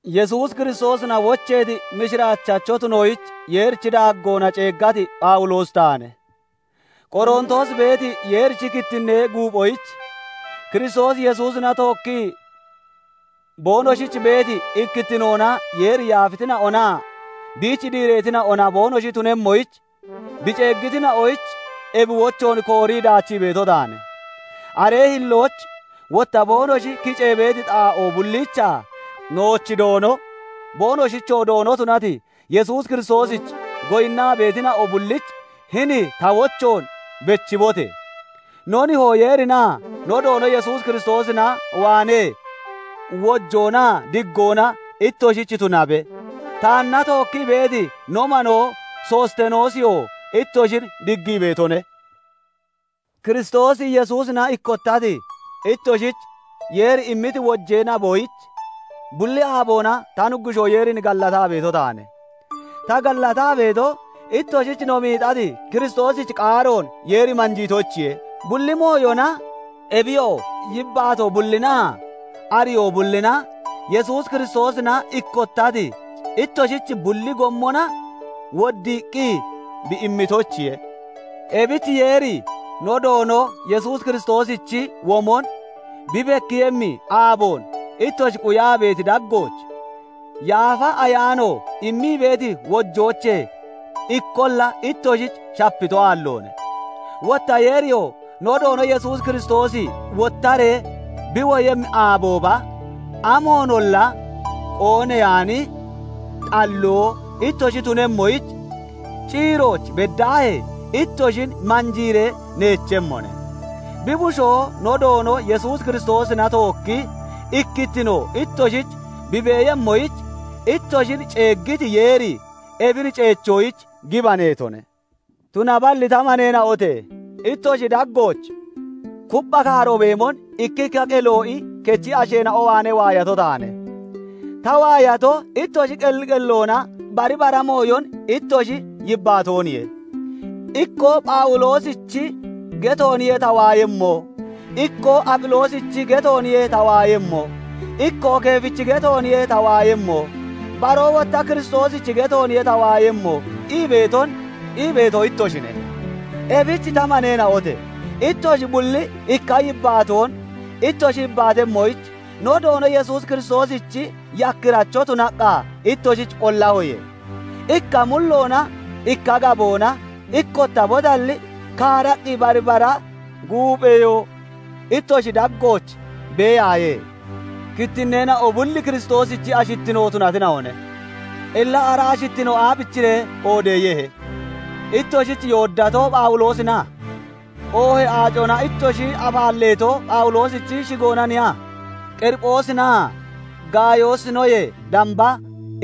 Yesuus Kiristoosina wocheeti, mishiraachacho tunoyich Yeerichi daaggoona ceeggati Phawuloosi taane. Qorontoos beeti Yeerichi kittinnee guuphoyich, Kiristoos Yesuusina tookkii boonoshich beeti ikkittinoona Yeeri yaafitina'onaa biich diireetina'ona boonoshi tunemmoyich bi ceeggitina'oyich, ebi wochoon koorii daachii beeto taane. Aree hillooch wotta boonoshi kicee beeti xaa'oo bulliichaa nooch Doono, boonoshichoo Doono tunati Yesuus Kiristoosich goyinnaa beetina'o bullich hini ta wochoon bechibote! No Nihoo Yeerinaa no Doono Yesuus Kiristoosina waanee wojoonaa diggoona ittoshich tunabe. Taanna tookkii beeti no manoo Sostenoosiyoo ittoshin diggii beetone. Kiristoos Yesuusina ikkottati ittoshich Yeeri immiti wojee naboyich bulli aaboona ta Nuggushoo Yeerin gallataa beeto taane. Ta gallataa beeto, ittoshich no miixati Kiristoosichi qaaroon Yeeri manjiitoyichiye; bulli mooyona, ebiyoo yibbaatoo bullinaa ariyoo bullina, Yesuus Kiristoosina ikkottati ittoshich bulli gommona woddiiqqi bi immitoyichiye. Ebich Yeeri no Doono Yesuus Kiristoosichi womon bi bekkiiyemmi aaboon ittoshi quyaa beeti daggooch, Yaafa Ayaano immii beeti wojoochee ikkolla ittoshich shapito aalloone; wotta Yeeriyoo no Doono Yesuus Kiristoosi wottaree bi woyemmi aabooba amoonolla qoonneyaani, xalloo ittoshi tunemmoyich, ciirooch beddaahee ittoshin manjiiree neechemmone. Bi bushoo no Doono Yesuus Kiristoosina tookki ikkittino ittoshich bi beeyemmoyich, ittoshin ceeggiti Yeeri ebin ceechoyich gibaneetone. Tunaballi ta maneena'ote! Ittoshi daggooch kuppha kaaro beemon ikkikka Qelo'i kechi asheena'o waanee waayato taane. Ta waayatoo, ittoshi qelli qelloona bari bara mooyon ittoshi yibbaatooniye. Ikkoo "Phawuloosichi getooniye ta waayemmo", ikkoo "Aphiloosichi getooniye ta waayemmo", ikkoo Keefichi getooniye ta waayemmo", baroo wotta "Kiristoosichi getooniye ta waayemmo" ii beeto ittoshine. Ebich ta maneena'ote! Ittoshi bulli ikka yibbaatoon ittoshi yibbaatemmoyich, no Doono Yesuus Kiristoosichi yakkiracho tunaqqa ittoshin qollahoye; ikka mulloonaa ikka gaboona ikkottabotalli, kaaraqqi bari bara guupheyoo ittoshi daggooch beeyaaye. Kittinneena'o bulli Kiristoosichi ashittino tunatina'one; illa ara ashittino aabichiree qoodeeyehe? Ittoshich yooddato, Phawuloosina? Oohee aacona ittoshi afaalleeto, Phawuloosichi shigoonaniya? Qeriphoosinaa Gaayoosinoyee damba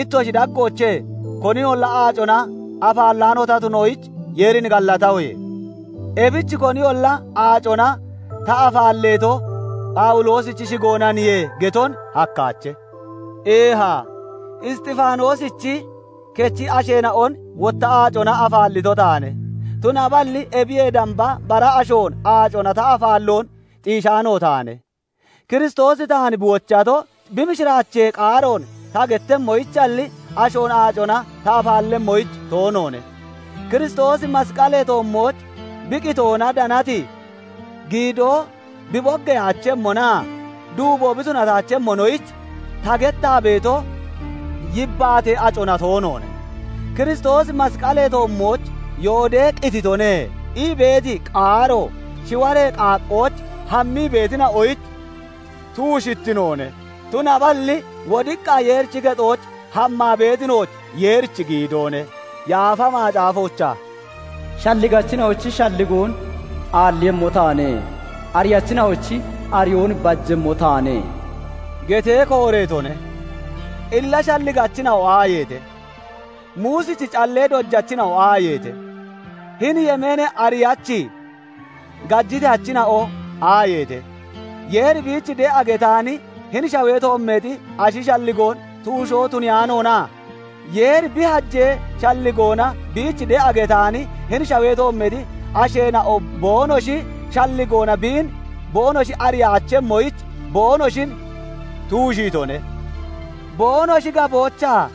ittoshi daggoochee koninolla aacona afaallaano ta tunoyich, Yeerin gallatahoye. Ebich koniyolla "Aacona ta afaalleeto, Phawuloosichi shigoonaniye" geton hakkaache. Eeha, Isxifaanoosichi kechi asheena'on wotta aacona afaallito taane; tunaballi ebiyee damba bara ashoon aacona ta afaalloon xiishaano taane. Kiristoosi taan bi wochato, bi mishiraachee qaaroon ta gettemmoyichalli, ashoon aacona ta afaallemmoyich toonoone; Kiristoosi masqalee toommooch bi qitoona danati giidoo bi boggeyaachemmonaa duubo bi tunataachemmonoyich, ta gettaa beeto yibbaatee acona toonoone. "Kiristoosi masqalee toommooch yoodee qititone" ii beeti qaaro shiwaree qaaqqooch hammii beetina'oyich tuushittinoone; tunaballi wodiqqa Yeerichi kexooch hammaa beeti nooch Yeerichi giidoone. Yaafa Macaafoochaa "Shalligachina'ochi shalligoon aalliiyemmo taane; Ariyachina'ochi ariyoon bajemmo taane" getee kooreetone. Illa shalligachina'o aayeete? Muusichi callee dojachina'o aayeete? Hini yemeenee ariyachi gajiteyachina'o aayeete? Yeeri biich de'a getaani hini shawee toommeexi ashi shalligoon tuushoo tuniyaanoona? Yeeri bi hajee shalligoona biich de'a getaani hini shawee toommeexi asheena'o boonoshi shalligoona biin boonoshi ariyaachemmoyich, boonoshin tuushiitone; boonoshi gaboochaa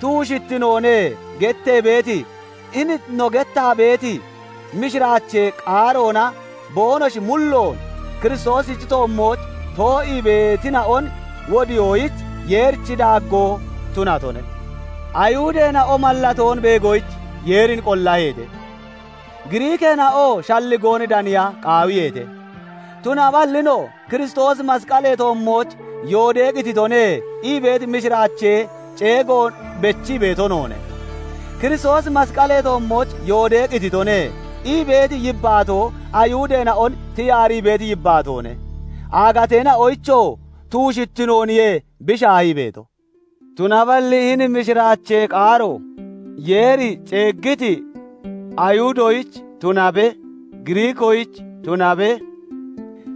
"tuushittinoone" gettee beeti, hini no gettaa beeti mishiraachee qaaroona boonoshi mulloon Kiristoosichi toommooch too'ii beetina'on wodiyoyich, Yeerichi daaggoo tunatone. Ayihudeena'o mallatoon beegoyich Yeerin qollaheete; Giriikeena'oo shalligoon daniya qaawiyeete; tunaballi no "Kiristoosi masqalee toommooch yooddee qititone" ii beeti mishiraachee ceegoon bechii beeto noone; "Kiristoosi masqalee toommooch yooddee qititone" ii beeti yibbaatoo Ayihudeena'on tiyaarii beeti yibaatoone; aagateena'oyichoo tuushittinooniye bi shaahii beeto. Tunaballi hini mishiraachee qaaro, Yeeri ceeggiti Ayihudoyich tunabe, Giriikoyich tunabe,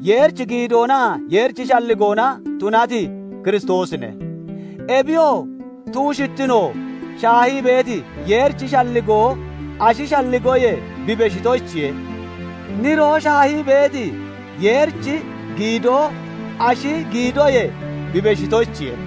Yeerichi giidoonaa Yeerichi shalligoona tunati Kiristoosine. Ebiyoo tuushittino shaahii beeti Yeerichi shalligoo ashi shalligoyee bi beshitoyichiye; niroo shaahii beeti Yeerichi giidoo ashi giidoyee bi beshitoyichiye.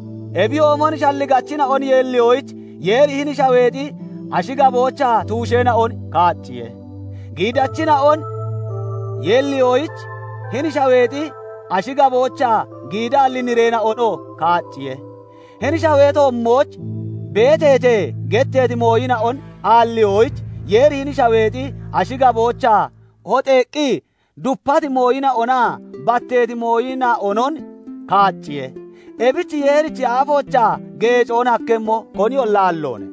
Ebiyoomon shalligachina'on yeelliyoyich, Yeeri hini shaweexi ashi gaboochaa tuusheena'on kaacciye; giidachina'on yeelliyoyich, hini shaweexi ashi gaboochaa giidaalli nireena'onoo kaacciye. "Hini shawee toommooch beeteete" getteeti mooyina'on aalliyoyich, Yeeri hini shaweexi ashi gaboochaa hoxeeqqi dupati mooyina'onaa batteeti mooyina'onon kaacciye; ebich Yeerichi aafoochaa geecoon hakkemmo koniyolla aalloone.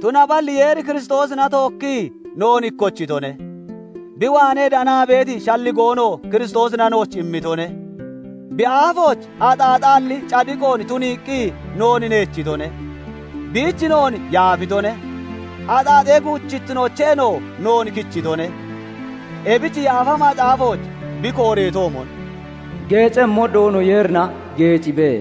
Tunaballi Yeeri Kiristoosina tookkii noon ikkochitone; bi waanee danaa beeti shalligoonoo Kiristoosina nooch immitone; bi aafooch axaaxaalli cadiqoon tuniiqqi noon nechitone; biich noon yaafitone; axaaxee guuchittinoocheenoo noon kichitone. Ebich Yaafa Macaafooch bi kooreetoomon, "Geecemmo Doono Yeerina geecibe".